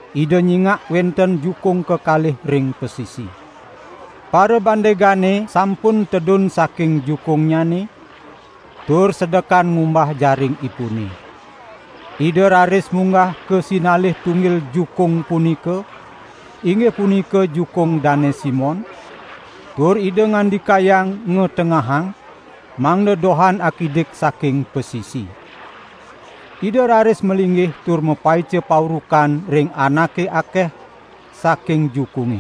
Ida nyingak wenten jukung kekalih ring pasisi. Parabandegane sampun tedun saking jukungnyane, tur sedekan ngumbah jaringipune. Ida raris munggah ka sinalih tunggil jukung punika, inggih punika jukung Dane Simon, tur Ida ngandikayang ngatengahang, mangda dohan akidik saking pasisi. Ida raris malinggih tur mapaica paurukan ring anake akeh saking jukunge.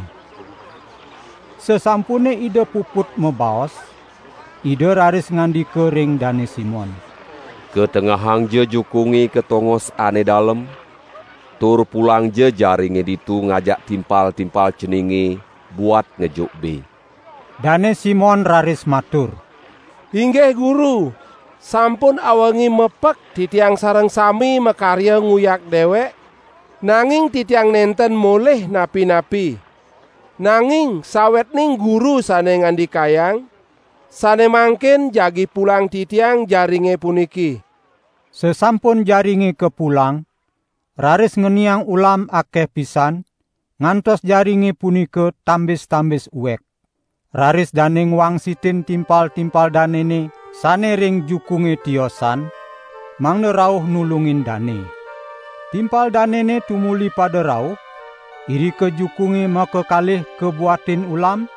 Sasampune Ida puput mabaos, Ida raris ngandika ring Dane Simon: "Katengahangja jukunge ka tongose ane dalem, tur pulangja jaringe ditu ngajak timpal-timpal ceninge, buat ngejuk be." Dane Simon raris matur: "Inggih Guru, sampun awengi mepek titiang sareng sami makarya nguyak dewek, nanging titiang nenten molih napi-napi. Nanging sawetning Guru sane ngandikayang, sane mangkin jagi pulang titiang jaringe puniki." Sasampun jaringe kapulang, raris ngeniang ulam akeh pisan, ngantos jaringe punika tambis-tambis uek. Raris dane ngwangsitin timpal-timpal danene sane ring jukunge tiosan, mangda rauh nulungin dane. Timpal danene tumuli pada rauh, irika jukunge makakalih kabuatin ulam,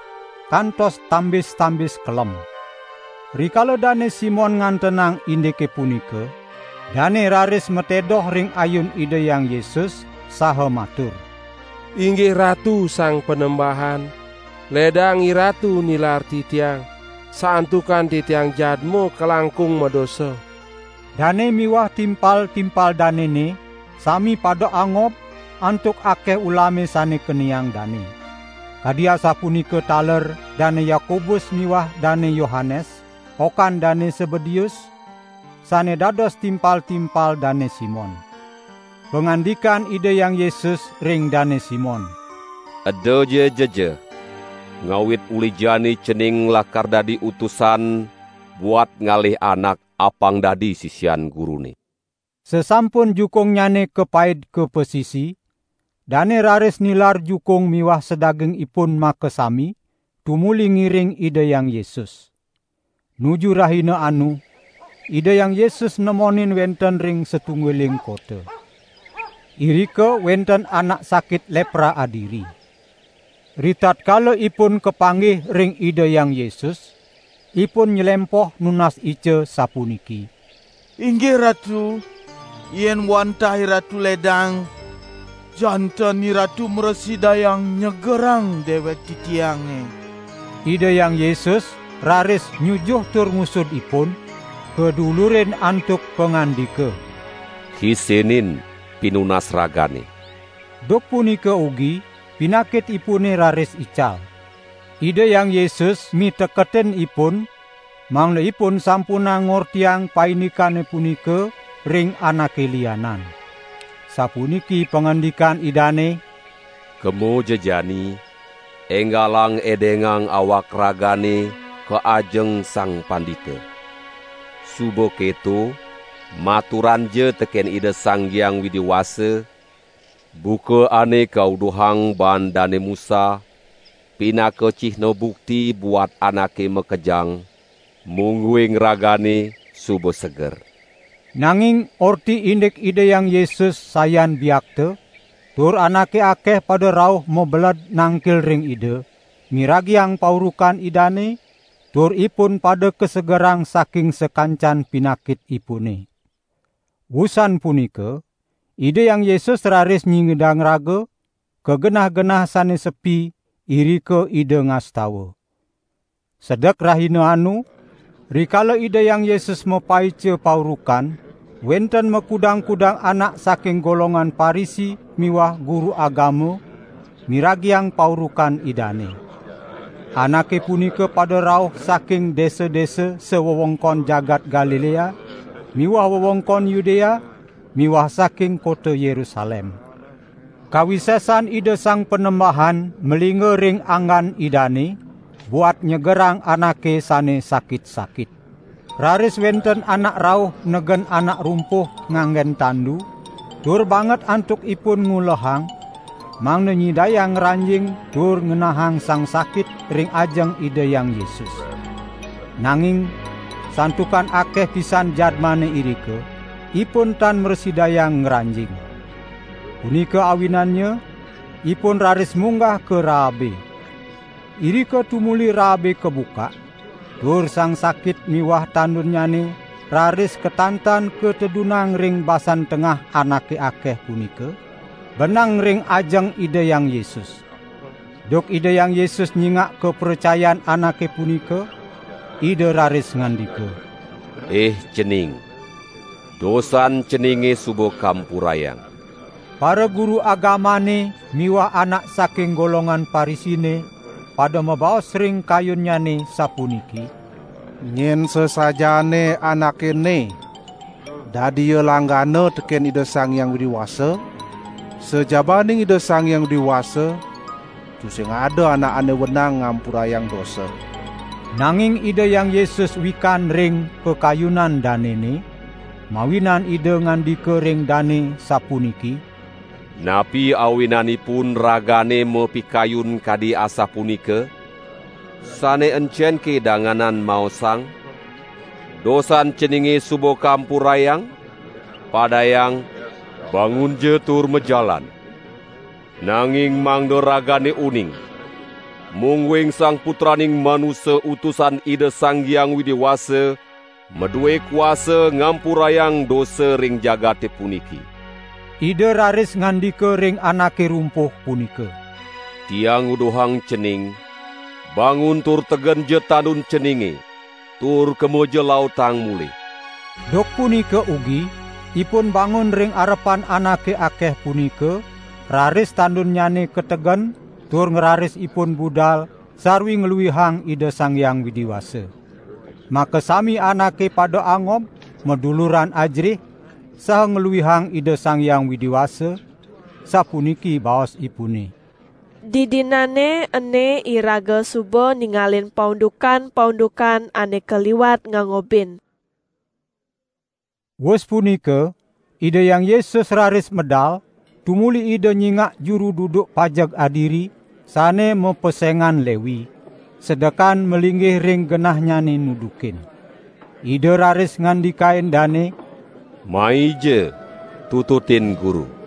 kantos tambis-tambis kelem. Rikala Dane Simon ngantenang indike punika, dane raris matedoh ring ayun Ida Hyang Yesus, saha matur: "Inggih Ratu Sang Panembahan, ledang IRatu nilar titiang santukan titiang jadma kalangkung madosa." Dane miwah timpal-timpal danene sami pada angob antuk akeh ulame sane keniang dane. Kadi asapunika taler Dane Yakobus miwah Dane Yohanes, okan Dane Sebedeus, sane dados timpal-timpal Dane Simon. Pangandikan Ida Hyang Yesus ring Dane Simon: "Edaja jejeh, ngawit uli jani cening lakar dadi utusan buat ngalih anak apang dadi sisian Gurune." Sasampun jukungnyane kapaid ka pasisi, dane raris nilar jukung miwah sadagingipun makasami, tumuli ngiring Ida Hyang Yesus. Nuju rahina anu Ida Hyang Yesus nemonin wenten ring satunggiling kota. Irika wenten anak sakit lepra adiri. Ritatkala ipun kapanggih ring Ida Hyang Yesus, ipun nylempoh nunas ica sapuniki: "Inggih Ratu, yen wantah IRatu ledang, janten IRatu mrasidayang nyegerang dewek titiange." Ida Hyang Yesus raris nyujuh tur ngusud ipun, kadulurin antuk pangandika: "Kisinin pinunas ragane." Duk punika ugi pinakitipune raris ical. Ida Hyang Yesus miteketin ipun mangda ipun sampunang ngortiang paindikane punika ring anake lianan. Sapuniki pangandikan Idane: "Kemaja jani enggalang edengang awak ragane ka ajeng sang pandita. Suba keto maturanja teken Ida Sang Hyang Widi Wasa, buka ane kauduhang baan Dane Musa, pinaka cihna bukti buat anake makejang, mungguing ragane suba seger." Nanging orti indik Ida Hyang Yesus sayan biakta, tur anake akeh pada rauh mabeled nangkil ring Ida, miragiang paurukan Idane, tur ipun pada kasegerang saking sakancan pinakitipune. Wusan punika Ida Hyang Yesus raris nyingidang raga, ka genah-genah sane sepi, irika Ida ngastawa. Sedek rahina anu, rikala Ida Hyang Yesus mapaica paurukan, wenten makudang-kudang anak saking golongan Parisi miwah guru agama miragiang paurukan Idane. Anake punika pada rauh saking desa-desa sawewengkon jagat Galilea miwah wewengkon Yudea miwah saking kota Yerusalem. Kawisesan Ida Sang Panembahan malingga ring anggan Idane buat nyegerang anake sane sakit-sakit. Raris wenten anak rauh negen anak rumpuh nganggen tandu; tur banget antukipun ngulehang mangda nyidayang ngranjing tur ngenahang sang sakit ring ajeng Ida Hyang Yesus. Nanging santukan akeh pisan jadmane irika, ipun tan mrasidayang ngranjing. Punika awinannya ipun raris munggah ka raabe. Irika tumuli raabe kabukak, tur sang sakit miwah tandunnyane raris katantan katedunang ring basan tengah anake akeh punika, beneng ring ajeng Ida Hyang Yesus. Duk Ida Hyang Yesus nyingak kapracayan anake punika, Ida raris ngandika: "Ih cening, dosan ceninge suba kampurayang." Paraguru agamane miwah anak saking golongan Parisine pada mabaos ring kayunnyane sapuniki: "Nyen sasajaane Anake ene? Dadi ia langgana teken Ida Sang Hyang Widi Wasa? Sajabaning Ida Sang Hyang Widi Wasa tusing ada anak ane wenang ngampurayang dosa." Nanging Ida Hyang Yesus wikan ring pakayunan danene, mawinan Ida ngandika ring dane sapuniki: "Napi awinanipun ragane mapikayun kadi asapunika? Sane encenke danganan maosang: 'Dosan ceninge suba kampurayang!' padayang: 'Bangunja tur majalan!'? Nanging mangda ragane uning, mungguing Sang Putraning Manusa Utusan Ida Sang Hyang Widi Wasa madue kuasa ngampurayang dosa ring jagate puniki." Ida raris ngandika ring anake rumpuh punika: "Tiang nguduhang cening, bangun tur tegenja tandun ceninge tur kemaja lautang mulih." Duk punika ugi ipun bangun ring arepan anake akeh punika, raris tandunnyane kategen tur ngraris ipun budal sarwi ngluihang Ida Sang Hyang Widi Wasa. Makasami anake pada angob, maduluran ajerih, saha ngluihang Ida Sang Hyang Widi Wasa, sapuniki baosipune: "Didinane ene iraga suba ningalin paundukan-paundukan ane kaliwat ngangobin." Wus punika Ida Hyang Yesus raris medal, tumuli Ida nyingak juru duduk pajeg adiri, sane mapesengan Lewi, sedekan malinggih ring genahnyane nudukin. Ida raris ngandikain dane: "Maija tututin Guru!"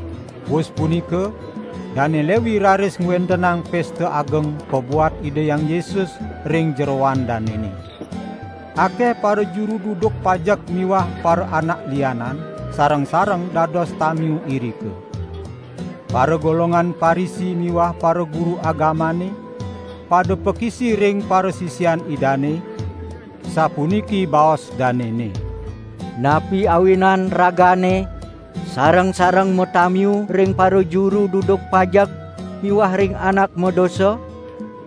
Wus punika Dane Lewi raris ngwentenang pesta ageng pabuat Ida Hyang Yesus ring jeroan danene. Akeh parajuru duduk pajeg miwah paraanak lianan sareng-sareng dados tamiu irika. Paragolongan Parisi miwah paraguru agamane, pada pakisi ring parasisian Idane, sapuniki baos danene: "Napi awinan ragane sareng-sareng matamiu ring parajuru duduk pajeg miwah ring anak madosa?"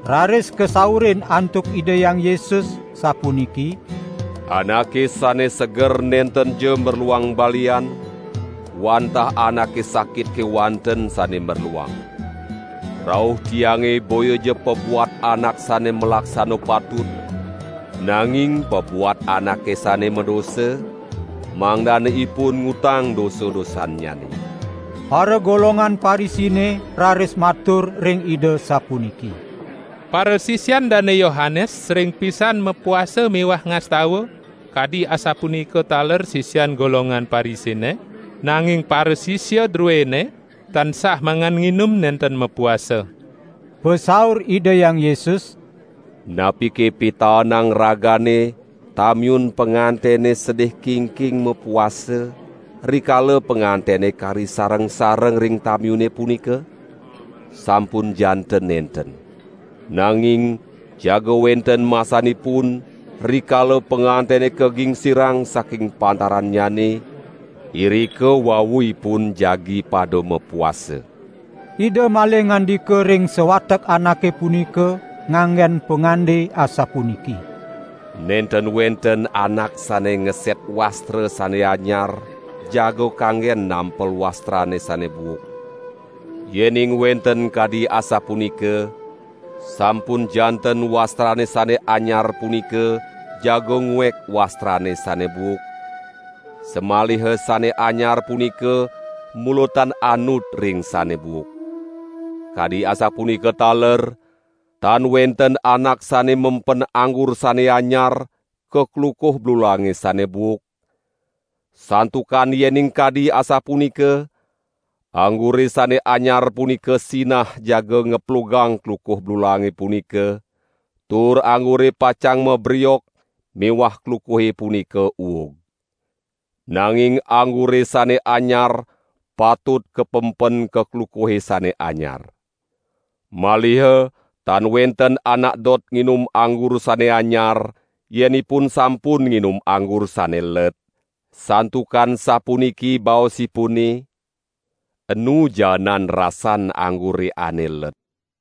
Raris kasaurin antuk Ida Hyang Yesus sapuniki: "Anake sane seger nentenja merluang balian, wantah anake sakit kewanten sane merluang. Rauh Tiange boyaja pabuat anak sane malaksana patut, nanging pabuat anake sane madosa, mangdane ipun ngutang dosa-dosannyane." Paragolongan Parisine raris matur ring Ida sapuniki: "Parasisian Dane Yohanes sering pisan mapuasa miwah ngastawa, kadi asapunika taler sisian golongan Parisine, nanging parasisia druene tansah mangan nginum nenten mapuasa." Pasaur Ida Hyang Yesus: "Napike pitaenang ragane tamiun pangantene sedih kingking mapuasa, rikala pangantene kari sareng-sareng ring tamiune punika? Sampun janten nenten! Nanging jaga wenten masanipun, rikala pangantene kagingsirang saking pantarannyane, irika wau ipun jagi pada mapuasa." Ida malih ngandika ring sawatek anake punika nganggen pangande asapuniki: "Nenten wenten anak sane ngeset wastra sane anyar jaga kanggen nampel wastrane sane buuk. Yening wenten kadi asapunika, sampun janten wastrane sane anyar punika jaga nguek wastrane sane buuk, samaliha sane anyar punika mula tan anut ring sane buuk. Kadi asapunika taler, tan wenten anak sane mempen anggur sane anyar ka klukuh blulange sane buuk, santukan yening kadi asapunika, anggure sane anyar punika sinah jaga ngeplugang klukuh blulange punika, tur anggure pacang mabriok miwah klukuhe punika uug. Nanging anggure sane anyar patut kapenpen ka klukuhe sane anyar. Maliha tan wenten anak dot nginum anggur sane anyar yen ipun sampun nginum anggur sane let, santukan sapuniki baosipune: 'Enu jaenan rasan anggure ane let.' "